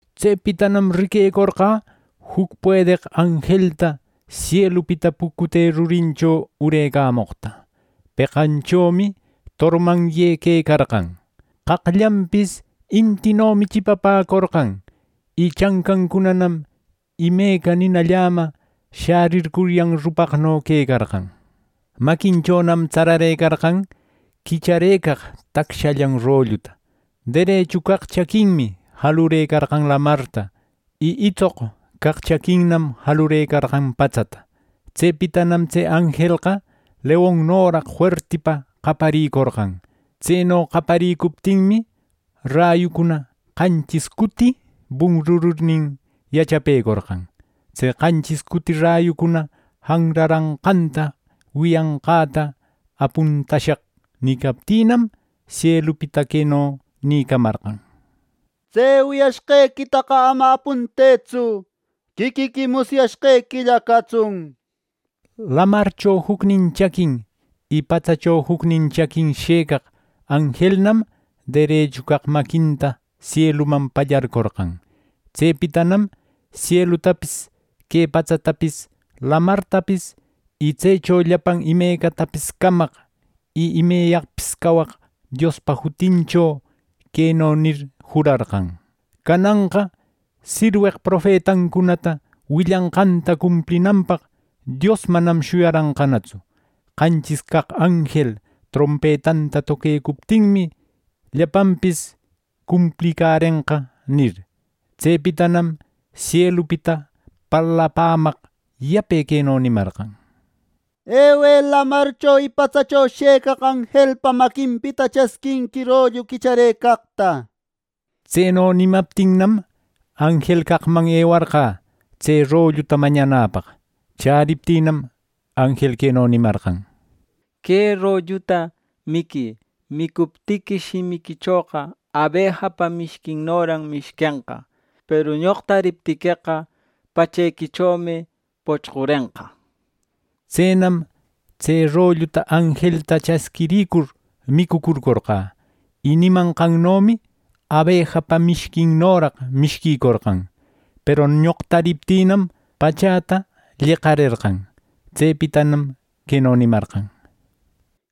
Tsepitanam riquecorqä juc puedeq anjelta sielupita pucute rurincho urecamoqta. Peqanchomi tormanye quecarqan. Qaqllanpis intinomi chipapäcorqan, y chancancunanam imeca nina llama shärircuryan rupaqno quecarqan. Maquinchonam tsararëcarqan quicharëcaq tacshallan rolluta. Derechu caq chaquinmi jalurëcarqan lamarta y itsoq caq chaquinnam jalurëcarqan patsata. Tsepitanam tse anjelqa leonnoraq fuertipa qaparicorqan. Tseno qaparicuptinmi, rayucunana qanchis cuti bunrururnin yachapärerqan. Tse qanchis cuti rayucuna janraranqanta wiyanqäta “Apuntashaq” nicaptïnam, sielupita queno nïcamarqan. “Tse wiyashqequitaqa ama apuntëtsu; quiquiqui musyashqequilla catsun” nir. Lamarcho jucnin chaquin y patsacho jucnin chaquin shëcaq anjelnam derechu caq maquinta sieluman pallarcorqan. Tsepitanam sielutapis, que patsatapis, lamartapis y tsecho llapan imecatapis camaq y imeyaqpis cawaq Diospa jutincho queno nir jurarqan: “¡Cananqa sirweq profetancunata willanqanta cumplinanpaq Dios manam shuyaranqanatsu! Qanchis caq anjel trompetanta toquecuptinmi, ¡llapanpis cumplicärenqa!” nir. Tsepitanam sielupita parlapämaq yape queno nimarqan: “Ewë lamarcho y patsacho shëcaq anjelpa maquinpita chasquinqui rollu quicharëcaqta” nir. Tseno nimaptinnam, anjel caqman ewarqä tse rolluta mañanäpaq. Chäriptïnam, anjel queno nimarqan: “Que rolluta miquï. Micuptiqui, shimiquichoqa abejapa mishquinnoran mishquenqa. Peru ñoqtariptiqueqa pachequichomi pochqurenqa” nir. Tsenam tse rolluta anjelta chasquiricur micucurcorqä, y nimanqannomi abejapa mishquinnoraq mishquicorqan; peru ñoqtariptïnam, pachäta lleqarerqan. Tsepitanam queno nimarqan: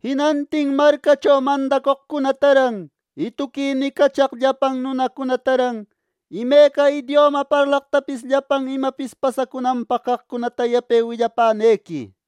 “Jinantin marcacho mandacoqcunataran y tuqui nicachaq llapan nunacunataran imeca idioma parlaqtapis llapan imapis pasacunanpaq caqcunata yape willapänequi” nir.